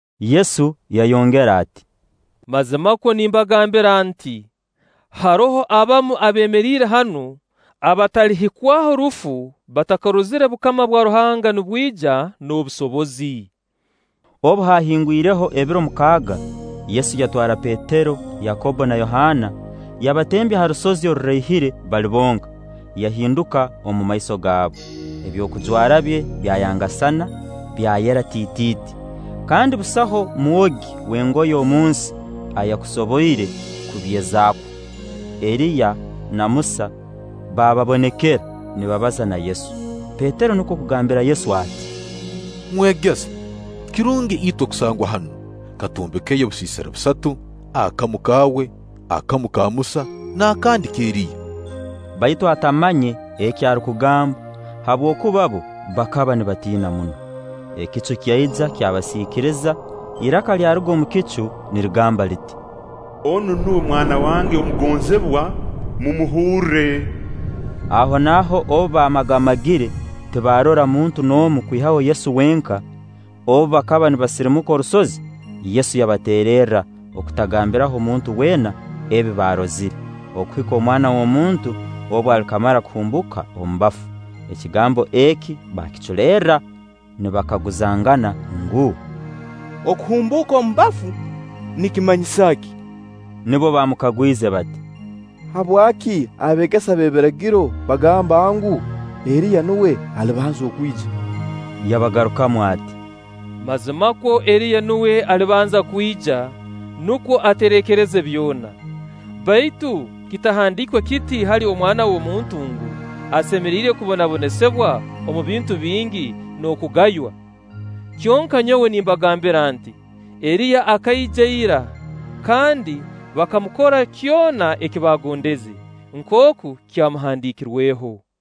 Yesu yayongera ati: “Mazimakwo nimbagambira nti: Haroho abamu abeemeriire hanu abatalihikwaho rufu batakarozire bukama bwa Ruhanga nibwija n'obusobozi.” Obu haahingwireho ebiro mukaaga, Yesu yatwara Petero, Yakobbo na Yohaana, yabatembya ha rusozi oruraihire bali bonka, yahinduka omu maiso gaabu, ebyokujwara bye byayangasana, byayera tiitiiti; kandi busaho mwogi w'engoye omu nsi ayaakusoboire kubyezaakwo. Eriya na Musa baababonekera, nibabaza na Yesu. Petero nukwo kugambira Yesu ati: “Mwegesa, kirungi itwe kusangwa hanu. Katwombeke obusiisira busatu: akamu kaawe, akamu ka Musa, n'akandi k'Eriya.” Baitu atamanye eki arukugamba, habwokuba bbo bakaba nibatiina muno. Ekicu kyaija kyabasiikiriza, iraka lyaruga omu kicu nirigamba liti: “Onu nuwe Mwana wange omugonzibwa, mumuhurre.” Ahonaaho obu bamagamagire, tibarora muntu n'omu kwihaho Yesu wenka. Obu bakaba nibasirimuka orusozi, Yesu yabateererra okutagambiraho muntu weena ebi baarozire, okuhika Omwana w'omuntu obu alikamara kuhumbuuka omu bafu. Ekigambo eki baakiculerra, nibakaguzangana ngu: Okuhumbuuka omu bafu nikimanyisa ki? Nubwo baamukagwize bati: “Habwaki abeegesa b'ebiragiro bagamba ngu, Eriya nuwe alibanza kwija?” Yabagarukamu ati: “Mazimakwo Eriya nuwe alibanza kwija, nukwo atereekereze byona; baitu kitahandiikwe kiti hali Omwana w'omuntu ngu: asemeriire kubonabonesibwa omu bintu bingi n'okugaywa? Kyonka nyowe nimbagambira nti: Eriya akaija ira, kandi bakamukora kyona eki baagondeze, nkooku kyamuhandiikirweho.”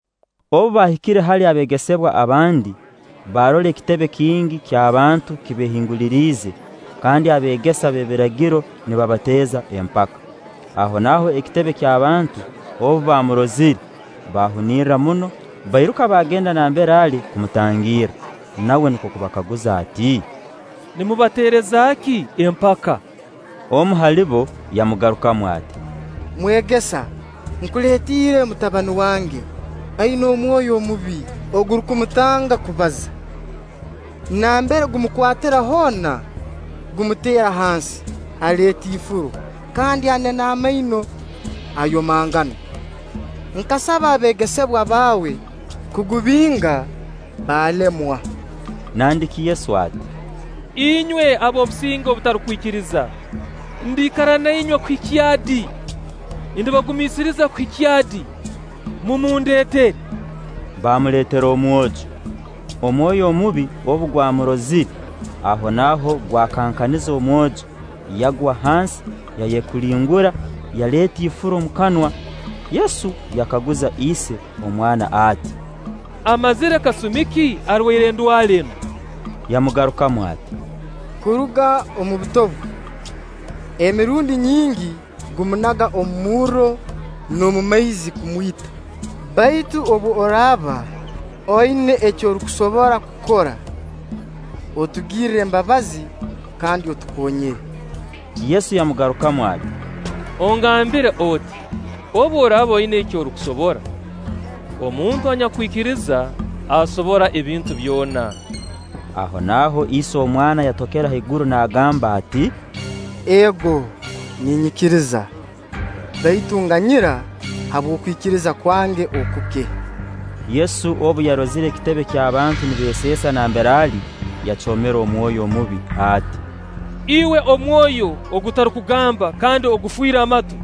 Obu baahikire hali abeegesebwa abandi, baarora ekitebe kingi ky'abantu kibeehinguliriize kandi abeegesa b'ebiragiro nibabateeza empaka. Ahonaaho ekitebe ky'abantu obu baamurozire, baahunirra muno, bairuka baagenda nambere ali kumutangirra. Nawe nukwo kubakaguza ati: “Nimubateereza ki empaka?” Omu hali bo yamugarukamu ati: “Mwegesa, nkuleetiire mutabani wange, aina omwoyo omubi ogurukumutanga kubaza. Nambere gukamukwatira hoona, gumuteera hansi; aleeta ifuro, kandi anena amaino, ayomangana. Nkasaba abeegesebwa baawe kugubinga, baalemwa.” Nandiki Yesu ati: “Inywe ab'obusinge obutarukwikiriza, ndiikara na inywe kuhikya di? Ndibagumiisiriza kuhikya di? Mumundeetere.” Baamuleetera omwojo. Omwoyo omubi obu gwamurozire, ahonaaho gwakankaniza omwojo, yagwa hansi, yayekulingura yaleeta ifuro omu kanwa. Yesu yakaguza ise omwana ati: “Amazire kasumi ki arwaire endwara enu?” Yamugarukamu ati: “Kuruga omu buto bwe. Emirundi nyingi gumunaga omu murro n'omu maizi kumwita; baitu obu oraaba oina eki orukusobora kukora, otugirre embabazi kandi otukonyere.” Yesu yamugarukamu ati: “Ogambire oti: obu oraaba oina eki orukusobora? Omuntu anyakwikiriza asobora ebintu byona.” Ahonaaho ise omwana yatokera haigura naagamba ati: “Ego ninyikiriza; baitu nganyira habw'okwikiriza kwange okuke!” Yesu obu yarozire ikitebe ky'abantu nibeeseesa nambere ali, yacoomera omwoyo omubi ati: “Iwe omwoyo ogutarukugamba kandi ogufiire amatu,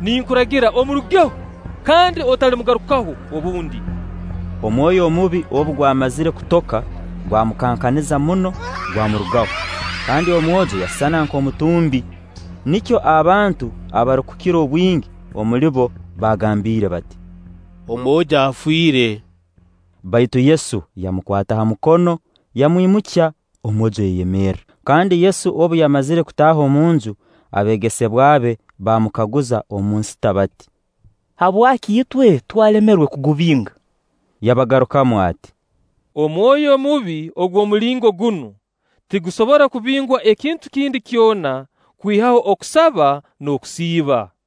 ninkuragira omurugeho, kandi otalimugarukaho obundi.” Omwoyo omubi obu gwamazire kutoka, gwamukankaniza muno, gwamurugaho, kandi omwojo yasisana nk'omutumbi. Nikyo abantu abarukukira obwingi omuli bo baagambiire bati: “Omwojo afiire.” Baitu Yesu yamukwata ha mukono, yamwimukya, omwojo yayemerra. Kandi Yesu obu yamazire kutaaha omu nju, abeegesebwa be baamukaguza omu nsita bati: “Habwaki itwe twalemerwe kugubinga?” Yabagarukamu ati: “Omwoyo omubi ogw'omulingo gunu, tigusobora kubingwa ekintu kindi kyona kwihaho okusaba n'okusiiba.”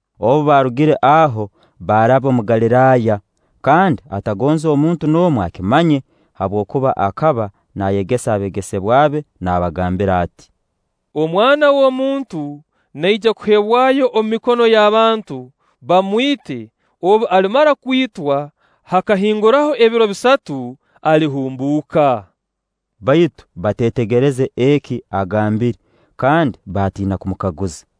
Obu baarugire aho, baaraba omu Galiraaya. kandi atagonze muntu n'omu akimanye; habwokuba akaba naayegesa abeegesebwa be naabagambira ati: “Omwana w'omuntu naija kuheebwayo omu mikono y'abantu, bamwite; obu alimara kwitwa, hakahinguraho ebiro bisatu alihumbuuka.” Baitu bateetegereze eki agambire kandi baatiina kumukaguza.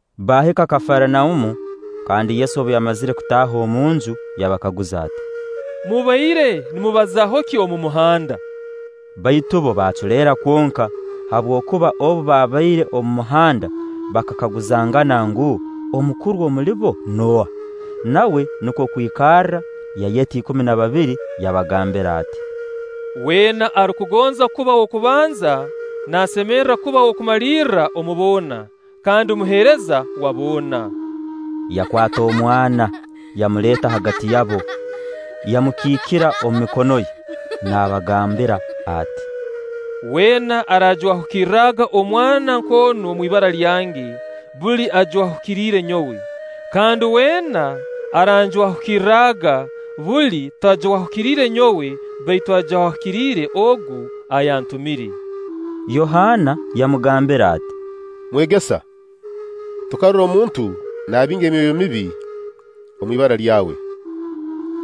Baahika Kafaranaumu; kandi Yesu obu yamazire kutaaha omu nju yabakaguza ati: “Mubaire nimubazaaho ki omu muhanda?” Baitu bbo baaculeera kwonka, habwokuba obu babaire omu muhanda bakakaguzangana ngu, Omukuru omulibo nooha? Nawe nukwo kwikarra, yayeta ikumi na babiri, yabagambira ati: “Weena arukugonza kuba w'okubanza naasemerra kuba w'okumalirrayo omu boona, kandi muheereza wa boona.” Yakwata omwana yamuleeta hagati yabo, yamukiikira omu mikono ye, naabagambira ati: “Weena araajwahukirraga omwana nk'onu omu ibara lyange, buli ajwahukiriire nyowe; kandi weena araanjwahukirraga, buli tajwahukiriire nyowe baitu ajwahukiriire Ogu ayantumiire.” Yohaana yamugambira ati: “Mwegesa, tukarora omuntu naabinga emyoyo emibi omu ibara lyawe;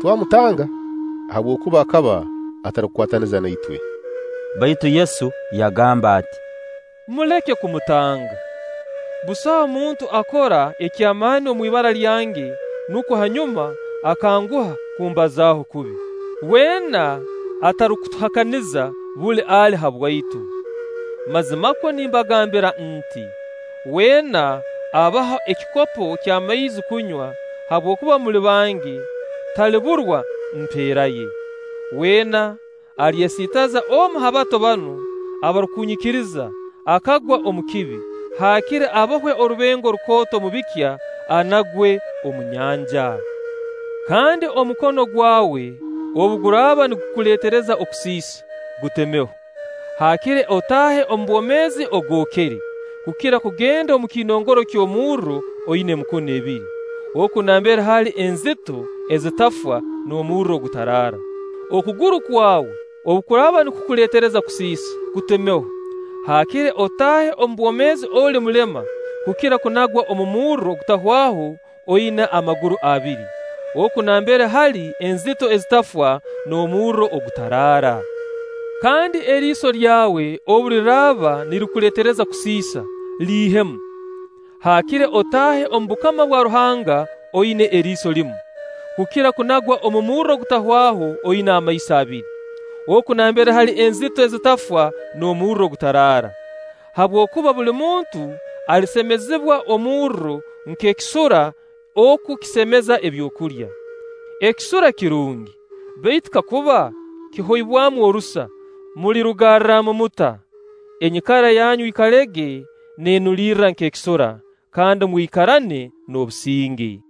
twamutanga, habwokuba akaba atarukukwataniza na itwe.” Baitu Yesu yagamba ati: “Muleke kumutanga. Busaho muntu akora eky'amaani omu ibara lyange nukwo hanyuma akanguha kumbazaaho kubi. Weena atarukutuhakaniza, buli ali habwaitu. Mazimakwo nimbagambira nti: Weena abaha ekikopo ky'amaizi kunywa, habwokuba muli bange, taliburwa mpeera ye.” “Weena alyesiitaza omu ha bato banu abarukunyikiriza akagwa omu kibi, haakire abohwe orubengo rukooto omu bikya, anagwe omu nyanja. Kandi omukono gwawe obu guraaba nigukuleetereza okusiisa, gutemeho; haakire otaahe omu bwomeezi ogookere, kukira kugenda omu kiinongoro ky'omurro oina emikono ebiri.[ Oku nambere hali enzito ezitafwa n'omurro ogutaraara.] Okuguru kwawe obu kuraaba nikukuleetereza kusiisa, kutemeho; haakire otaahe omu bwomeezi oli mulema, kukira kunagwa omu murro ogutahwaho oina amaguru abiri. [ Oku nambere hali enzito ezitafwa n'omurro ogutaraara.] Kandi eriiso lyawe obu liraaba nirikuleetereza kusiisa, liihemu; haakire otaahe omu bukama bwa Ruhanga oina eriiso limu, kukira kunagwa omu murro ogutahwaho oina amaiso abiri. Oku nambere hali enzito ezitafwa n'omurro ogutaraara. Habwokuba buli muntu alisemezibwa omurro nk'ekisura oku kisemeza ebyokulya. Ekisura kirungi; baitu kakuba kihoibwamu orusa, mulirugarramu muta? Enyikara yanyu ikalege neenulirra nk'ekisura, kandi mwikarane n'obusinge.”